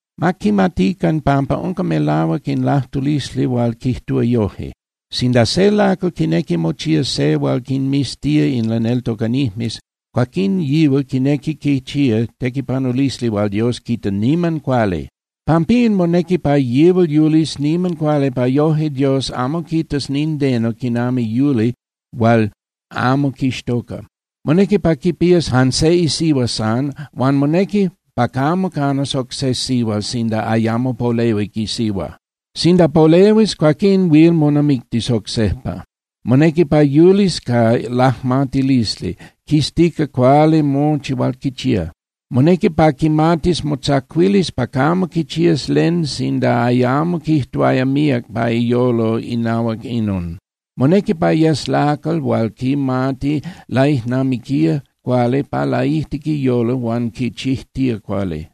Ma quimatican pampa unca melahuac in lajtulisli hual quijtúa yoje: Sinda se lacal quinequi mochía se hual quinmiztía in laneltocanijmes, cuaquín yihual quinequi quichía tequipanulisli hual Dios quita niman cuali. Pampín, monequi pa yihual yulis niman cuali pa yoje Dios amo quitas nindeno quinami yuli hual amo quixtoca. Monequi pa quipías jan se isihua san huan monequi pa camo canas oc se sihual sinda ayamo polehuic isihua. Sinda polehuis, cuaquín huil monamictis oc sejpa. Monequi pa yulis ca lajmatilisli, quiztica cuali mochi hual quichía. Monequi pa quimatis motzacuilis pa camo quichías len sinda ayamo quijtuaya míac pa iyolo inahuac inon. Monequi pa yes lacal hual quimati laijnamiquía cuali pa laijtic iyolo huan quichijtía cuali.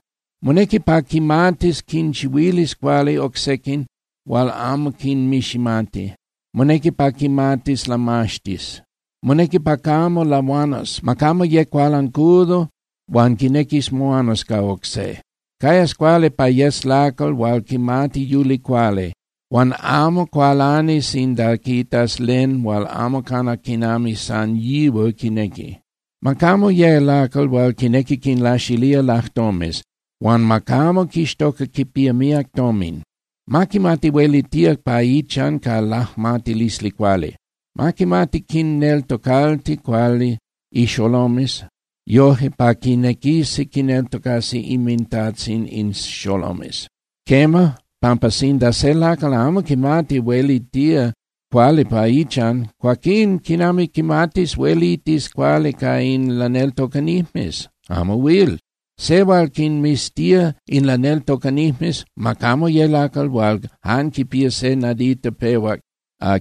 Monequi pa quimatis quinchihuilis cuali oc sequin hual amo quinmiximati. Monequi pa quimatis lamaxtis. Monequi pa camo lahuanas. Ma camo ye cualancudo hual quinequis moanas ca oc se. Cayas cuali pa yes lacal hual quimati yuli cuali, hual amo cualani sinda quitas len hual amo cana quinami san yihual quinequi. Ma camo ye lacal hual quinequi quinlaxilía lajtomes, huan ma camo quixtoca quipía míac tomin. Ma quimati huelitía pa ichan ca lajmatilisli cuali. Ma quimati quinneltocalti cuali ixolomes yoje pa quinequisi quineltocasi inmintajtzin in xolomes. Quema, pampa sinda se lacal amo quimati huelitía cuali pa ichan, cuaquín ¿quinami quimatis huelitis cuali ca in laneltocanijmes? Amo huil. Se hual quinmiztía in laneltocanijmes ma camo ye lacal hual jan quipía je nadita pehuac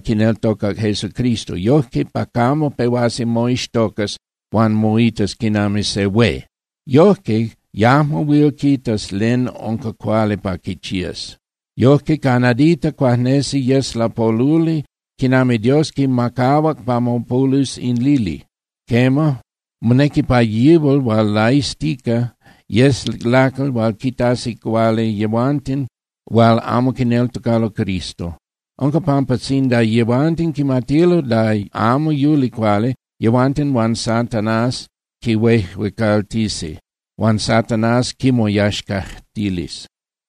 quineltocac Jesucristo, yojque pa camo pehuas moixtocas huan moitas quinami se hué. Yojque yajmo huil quitas len unca cuali pa quichías. Yojque ca nadita cuajnesi yes lapoluli quinami Dios quimacahuac pa mopolus in lili. Quema, monequi pa yihual hual laiztica yes lacal hual quitasi cuali yehuanten hual amo quineltocalo Cristo. Unca pampa sinda yehuanten quimatilo da amo yuli cuali, yehuanten huan Satanás quihuejuecaltisi, huan Satanás quimoyaxcajtilis.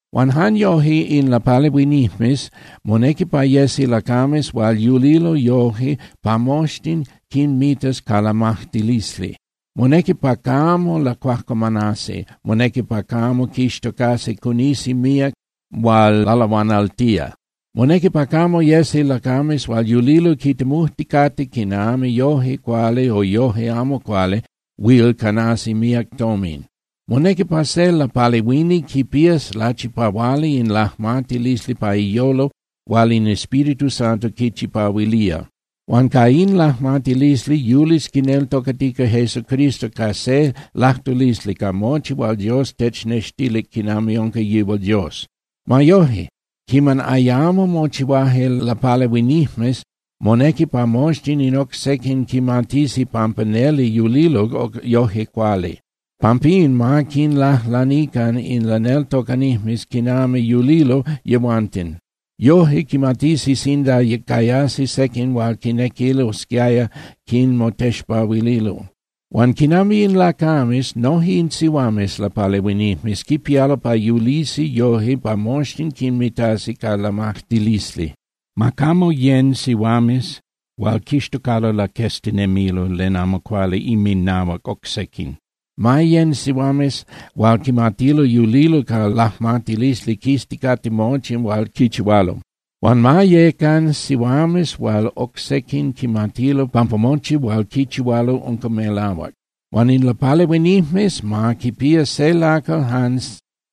Huan jan yoje in lapalehuinijmes monequi pa yesi lacames hual yulilo yoje pa moxtin quinmitas ca lamajtilisli. Monequi pa camo lacuajcuamanasi, monequi pa camo quixtocasi cunisi míac hual lalahuanaltía. Monequi pa camo yesi lacames hual yulilo quitemujticate quinami yoje cuali o yoje amo cuali huil canasi míac tomin. Monequi pa se lapalehuini quipías lachipahuali in lajmatilisli pa iyolo hual in Espíritu Santo quichipahuilía. Huan ca in lajmatilisli yulis quineltocatica Jesucristo ca se lajtulisli ca mochi hual Dios technextilic quinami unca yihual Dios. Ma yoje, quiman ayamo mochihuaje lapalehuinijmes, monequi pa moxtin in oc sequin quimatisi pampa neli yulilo yoje cuali. Pampín ma quinlajlanican in laneltocanijmes quinami yulilo yehuanten. Yoje quimatisi sinda cayasi sequin hual quinequilosquiaya quinmotexpahuililo. Huan quinami in lacames, noje in sihuames lapalehuinijmes quipialo pa yulisi yoje pa moxtin quinmitasi ca lamajtilisli. Ma camo yén (yecan) sihuames hual quixtocalo laqueztinemilo len amo cuali inminahuac oc sequin. Ma yén (yecan) sihuames hual quimatilo yulilo ca lajmatilisli quizticate mochi hual quichihualo. Huan ma yecan sihuames hual oc sequin quimatilo pampa mochi hual quichihualo unca melahuac. Huan in lapalehuinijmes, ma quipía se lacal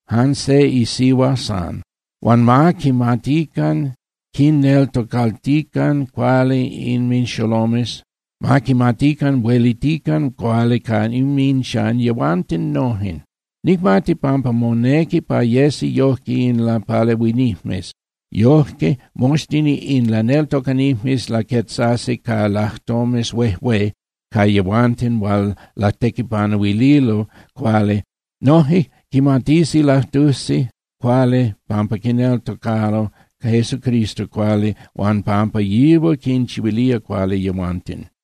jan se isihua san. Huan ma quimatican quinneltocaltican cuali inminxolomes, ma quimatican huelitican cuali pa inminchan yehuanten nojen. Nicmati pampa monequi pa yesi yojque in lapalehuinijmes. Yojque moxtin in laneltocanijmes laquetzasi ca lajtomes huejué pa yehuanten hual latequipanuililo cuali. Noje quimatisi lajtusi cuali pampa quineltocalo Jesucristo cuali huan pampa yihual quinchihuilía cuali yehuanten.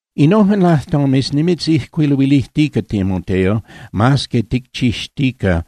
Innojen lajtomes nimitzijcuiluilijtica, Timoteo, mas que nicchixtica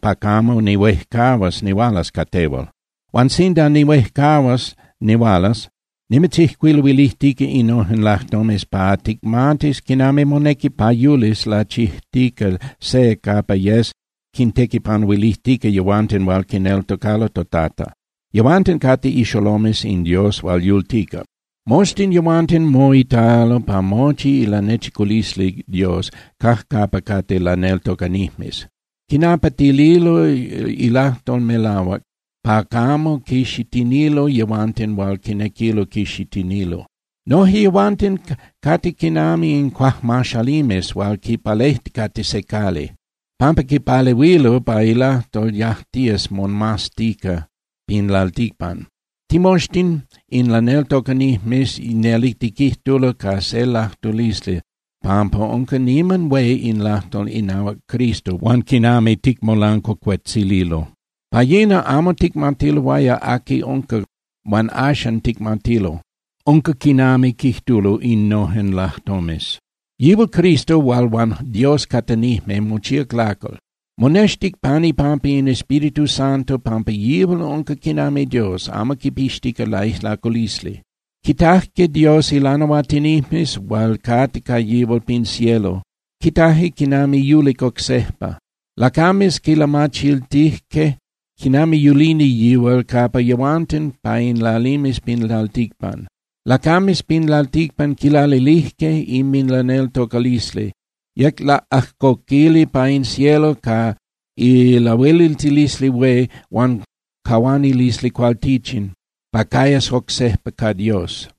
pa camo nihuejcahuas nihualas ca tehual. Huan sinda nihuejcahuas nihualas, nimitzijcuiluilijtica innojen lajtomes pa ticmatis quinami monequi pa yulis lachijtica se capa yes quintequipanuilijtica yehuanten hual quineltocalo toTata. Yehuanten cate ixolomes in Dios hual yultica. Moxtin yehuanten moitalo pa mochi ilanechiculisli Dios cajcapa cate laneltocanijmes. Quinapatililo ilajtol melahuac pa camo quixitinilo yehuanten hual quinequilo quixitinilo. Noje yehuanten cate quinami in cuajmaxalimes hual quipalejticate se cali, pampa quipalehuilo pa ilajtol yajtías momaztica pin lalticpan. Timoxtin in laneltocanijmes neli tiquijtulo ca se lajtulisli pampa unca niman hué in lajtol inahuac Cristo huan quinami ticmolancuacuetzililo. Pa yina amo ticmatiloaya aqui unca huan axan ticmatilo. Unca quinami quijtulo innojen lajtomes: Yihual Cristo hual huan Dios catanijme, mochíac lacal. Monextic pan ipampa in Espíritu pampa yihual unca quinami Dios, amo quipixtica laijlaculisli. Quitajque Dios ilanahuatinijmes hual cate ca yihual pin cielo, quitaje quiman yulic oc sejpa. Lacames quilamachiltijque quinami yulini yihual capa yehuanten pa in lalimes pin lalticpan. Lacames pin lalticpan quilalilijque inminlaneltocalisli. Yec laꞌajcoquili pa in cielo ca ilahueliltilisli hué huan cahuanilisli cualtichin pa cayas oc sejpa ca Dios.